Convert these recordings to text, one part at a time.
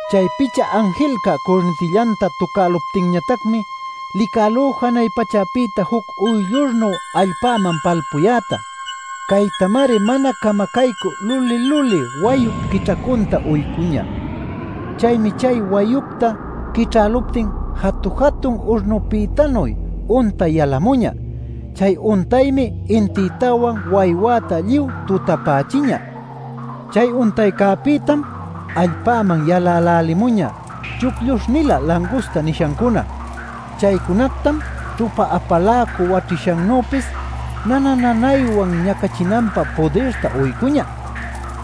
Chay picha anjilca curnitillanta tucäluptinñatacmi licälú janay pachäpïta juc uyllurnuy allpäman palpuyäta. Caytamari mana camacaycü luli-luli wayup quićhacunta uycüñä. Chaymi chay wayucta quićhäluptin jatu-jatun urnupïtanuy untay yalämuñä. Chay untaymi intïtawan waywäta lluy tutapächiñä. Chay untaycäpïtam allpäman yalälälimuñä chuclluśh-nilä “langusta” nishancuna. Chaycunactam ćhupa-apaläcu waćhishannüpis nana-nanaywan ñacachinanpä pudirta uycüñä.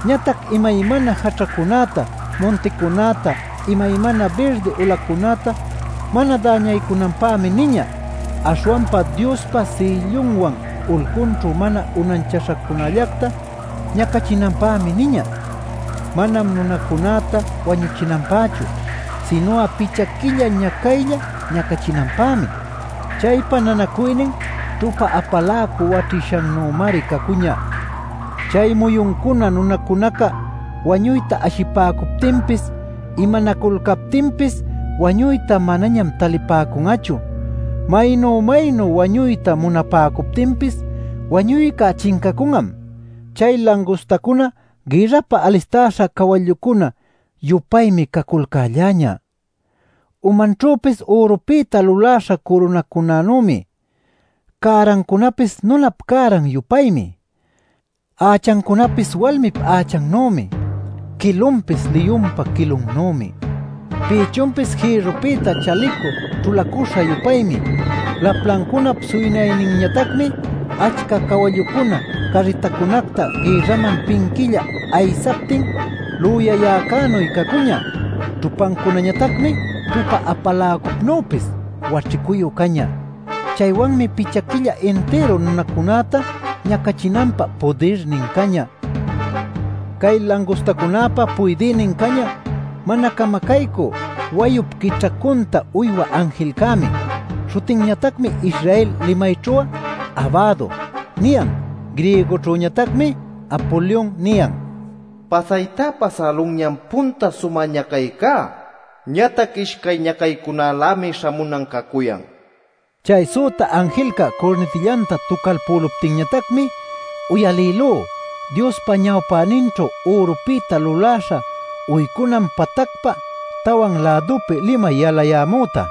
Ñatac imaymana jaćhacunäta, munticunäta, imaymana birdi ulacunäta mana däñaycunanpämi niñä. Aśhwanpa Diospa sïllunwan ulcunćhu mana unanchaśhacunällacta ñacachinanpämi niñä. Manam nunacunäta wañuchinanpächu, sinu'a picha quilla ñacaylla ñacachinanpämi. Chaypa nanacuynin ćhupa-apaläcu waćhishanümari cacuñä. Chay muyuncuna nunacunaca wañuyta ashipäcuptinpis, imanaculcaptinpis wañuyta manañam talipäcun'achu. Maynu-maynu wañuyta munapäcuptinpis wañuyca chincacun'am. Chay langustacuna gïrrapä alistäśha cawallucuna-yupaymi caculcälläñä. Umanćhüpis ürupïta luläśha curunacunanümi; cärancunapis nunap cäran-yupaymi. Ächancunapis walmip ächannümi. Quilunpis liyunpa quilunnümi. Pïchunpis jïrrupïta chalicu ćhulacüśha-yupaymi. Laplancunap suynayninñatacmi achca cawallucuna carritacunacta gïrraman pinquilla aysaptin lüyayäcänuy cacuñä. Ćhupancunañatacmi ćhupa-apaläcupnüpis waćhicuyu cañä. Chaywanmi picha quilla intiru nunacunäta ñacachinanpä pudirnin cañä. Cay langustacunäpa puydïnin cañä mana camacaycü wayup quićhacunta uywä anjilcämi. Śhutinñatacmi Israel limayćhu'a “Abado” niyan; griegoćhüñatacmi “Apolion” niyan. Pasayta pasälunñam punta sumä ñacaycá. Ñatac ishcay ñacaycunalämi śhamunan cacuyan. Chay süta anjilca curnitillanta tucalpüluptinñatacmi, uyalïlú Diospa ñawpäninćhu ürupïta luläśha uycunan patacpa tawan lädunpi limay yalayämüta.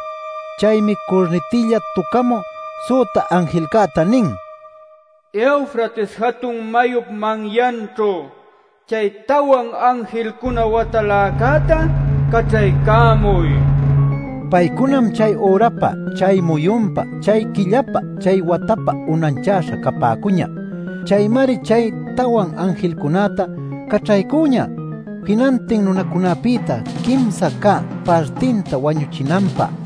Chaymi curnitilla tucamü süta anjilcäta nin: “Eufrates jatun mayup manyanćhu chay tawan anjilcuna wataläcäta caćhaycamuy” nil. Paycunam chay ürapa, chay muyunpa, chay quillapa, chay watapa unanchäśha capäcuñä. Chaymari chay tawan anjilcunäta caćhaycüñä, jinantin nunacunapïta quimsa cä partinta wañuchinanpä.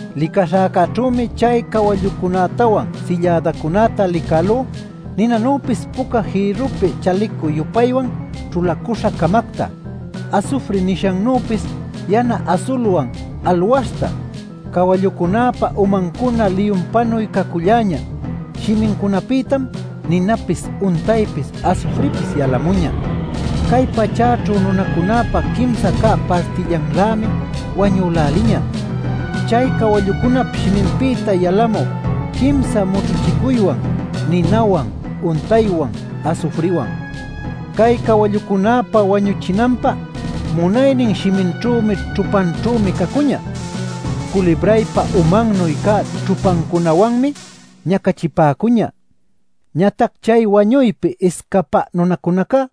Licaśhäcäćhümi chay cawallucunätawan sillädacunäta licälú ninanüpis puca jïrrupi chalicu-yupaywan ćhulacüśha-camacta, asufri nishannüpis yana asulwan alwaśhta. Cawallucunäpa umancunam liyunpanuy caculläñä; shimincunapïtam ninapis, untaypis, asufripis yalamuñä. Cay pachäćhu nunacunäpa quimsa cä partillanlämi wañüläliñä chay cawallucunap shiminpïta yalamü quimsa mućhuchicuywan: ninawan, untaycäwan, asufriwan. Cay cawallucunäpa wañuchinanpä munaynin shiminćhümi ćhupanćhümi cacuñä. Culibraypa umannuy cä ćhupancunawanmi ñacachipäcuñä. Ñatac chay wañuypi iscapä nunacunaca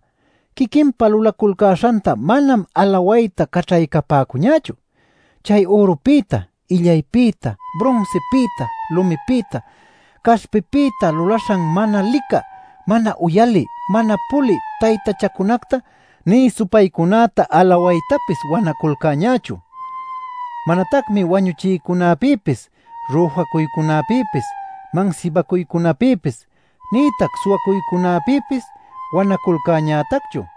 quiquinpa lulaculcäśhanta manam alawayta caćhaycapäcuñächu: chay ürupïta illaypïta, brunsipïta, lumipïta, caśhpipïta luläśha mana licä, mana uyalï, mana pulï taytachacunacta, nï supaycunäta alawaytapis wanaculcäñächu. Manatacmi wañuchiycunapïpis, rüjacuycunapïpis, mansibacuycunapïpis, nïtac suwacuycunapïpis wanaculcäñätacchu.